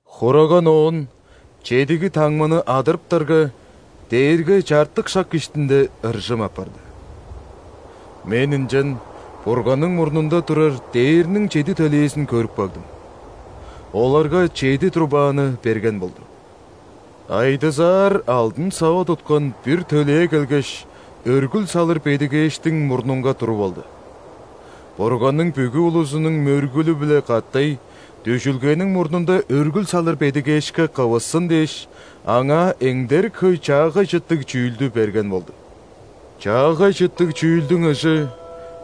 Хураган оон чедиги таңманы адырыптарга, дээрге чартык шак иштинде ыржым апарды. Мен ынчан Бурганның мурнунда турар дээрниң чеди төлээзин көрүп кагдым. Оларга чеди трубаны берген болду. Айдызаар алдын сава туткан бир төлээ келгеш, өргүл салыр бедигээштиң мурнунга туруп алды. Бурганның бүгү улузунуң мөргүлү-биле катай дүжүлгениң мурнунда өргүл салыр бедигээшке кывыссын дээш, аңаа эңдерик хөй чаагай чыттыг чүүлдү берген болду. Чаагай чыттыг чүүлдүң ыжы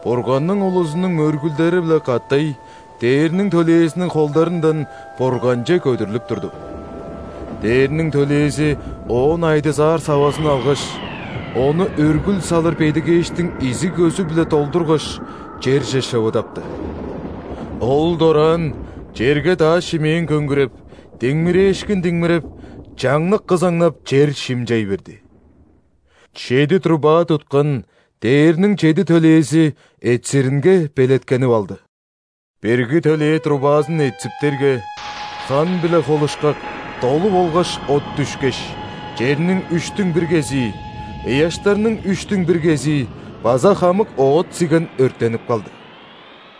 Бурганның улузунуң мөргүлдери-биле катай ·дээрниң төлээзиниң холдарындан Бурганче көдүрлүп турду. Дээрниң төлээзи оон айдызаар савазын алгаш, ону өргүл салыр бедигээштиң изиг көзү-биле долдургаш, черже шывадапты. Ол дораан черге дааш-шимээн көңгүреп, диңмирээшкин диңмиреп, чаңнык кызаңнап, чер шимчей берди. Чеди труба туткан дээрниң чеди төлээзи этсиринге белеткенип алды. Бирги төлээ трубазын этсиптерге, хан-биле холушкак долу болгаш от дүшкеш, черниң үштүң бир кезии, ыяштарның үштүң бир кезии база хамык оът-сиген өрттенип калды.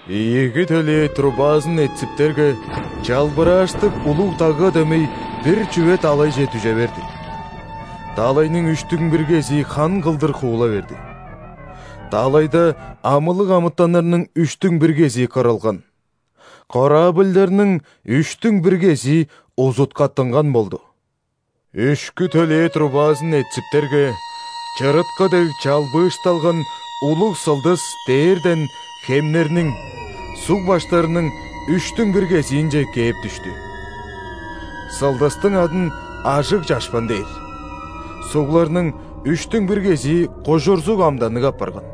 Ийиги төлээ трубазын этсиптерге, чалбырааштыг улуг дагга дөмей бир чүве далайже дүже берди. Далайның үштүң бир кезии хан кылдыр хуула берди. Далайда амылыг амытаннарның үштүң бир кезии кырылган, корабльдарның үштүң бир кезии узуткаттынган болду. Үшкү төлээ трубазын этсиптерге, чырыткы дег чалбыышталган улуг сылдыс дээрден хемнерниң, суг баштарының үштүң бир кезиинче кээп дүштү. Сылдыстың адын Ажыг чашпан дээр. Сугларның үштүң бир кезии кужурзуг амданныг апарган.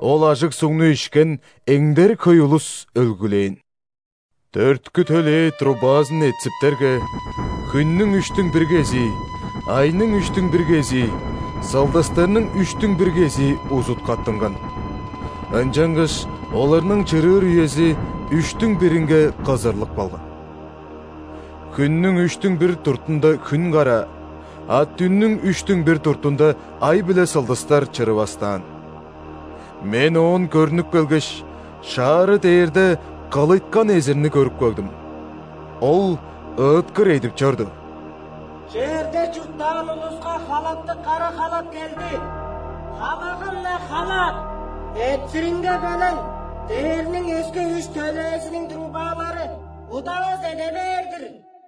Ол ажыг сугну ишкен эңдерик хөй улус өлгүлээн. Дөрткү төлээ трубазын этсиптерге, хүннүң үштүң бир кезии, айның үштүң бир кезии, сылдыстарның үштүң бир кезии узуткаттынган, ынчангаш оларның чырыыр үези үштүң биринге кызырлып калган. Хүннүң үштүң бир дуртунда хүн караа, а дүннүң үштүң бир дуртунда ай биле сылдыстар чырывастаан. Мен оон көрнүп келгеш, шаары дээрде кылыйткан эзирни көрүп кагдым. Ол ыыткыр эдип чорду: «Черде чурттаан улуска халаптыг кара халап келди, халагым-на халак! Этсиринге белен дээрниң өске үш төлээзиниң трубалары удавас эде бээр-дир!»